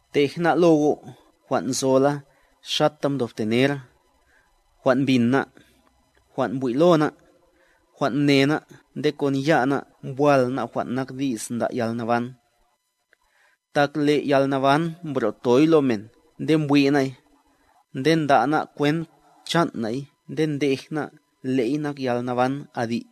Tej ná' lo go' jwan' nzola xata mdobte nera, jwan' mbin ná', jwan' mbwi' lo ná', jwan' mne ná' nde kon ya' ná' mbwal ná' jwan' nak Di's nda' yalnaban. Tak le' yalnaban mbro'toy lo men nde mbwi' ná'y, nde nda' ná' kwent chan' na'y nde ndej ná' le'y nak yalnaban adi',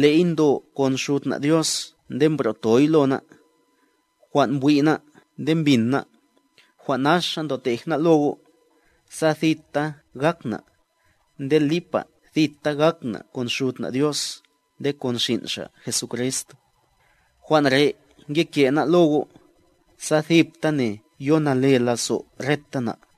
le'y ndo kon Xud na' Dios nde mbro'toy lo ná'. Jwan' mbwi' ná' nde mbin ná', jwan' naxa ndotej ná' lo go', sa thita gak na', nde lipa thita gak na' kon Xud na' Dios nde kon xin' Xa' Jesucrist. Jwan' re' ngeke' ná' lo go', sa thiptane yo nale lazo' reta na'.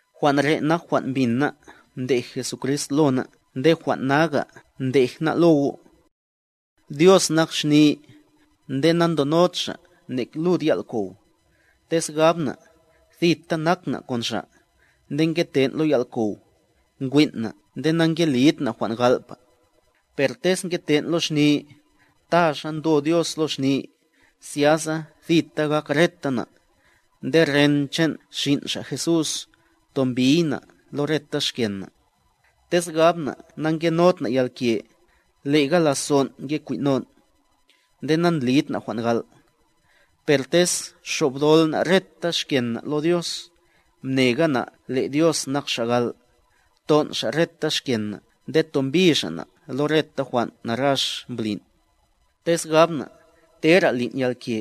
Jwan' re' nak jwan' mbin ná' mdej Jesucrist lo ná' nde jwan' naga ndeja ná' lo go': Dios nak xni, nde na'ndonod Xa' nek lud yal'kow. Tez gab na', thita nak na' kon Xa', nde ngeten' lo yal'kow, nkwin' na' nde na'ngelid na' jwan' gal'pa. Per tez ngeten' lo xni, ta xa ndo Dios lo xni, zyasa thita gak reta na', nde ren chan' Xin' Xa' Jesús, tombiy na' lo reta xken na'. Tez gab na' na'ngenod na' yalke, le'ga lazon' nge kwin'non', nde nandlid na' jwan' gal'. Per tez xobdol na' reta xken na' lo Dios, mnega na' le' Dios nak Xa' gal', ton' Xa' reta xken na' nde tombi Xa' na' lo reta jwan' narax mblin'. Tez gab na', tera lin' yalke,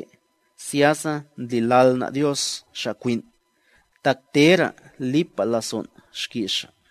zyasa ndlilal na' Dios Xa' kwin', tak tera' lipa lazon' xki's Xa'.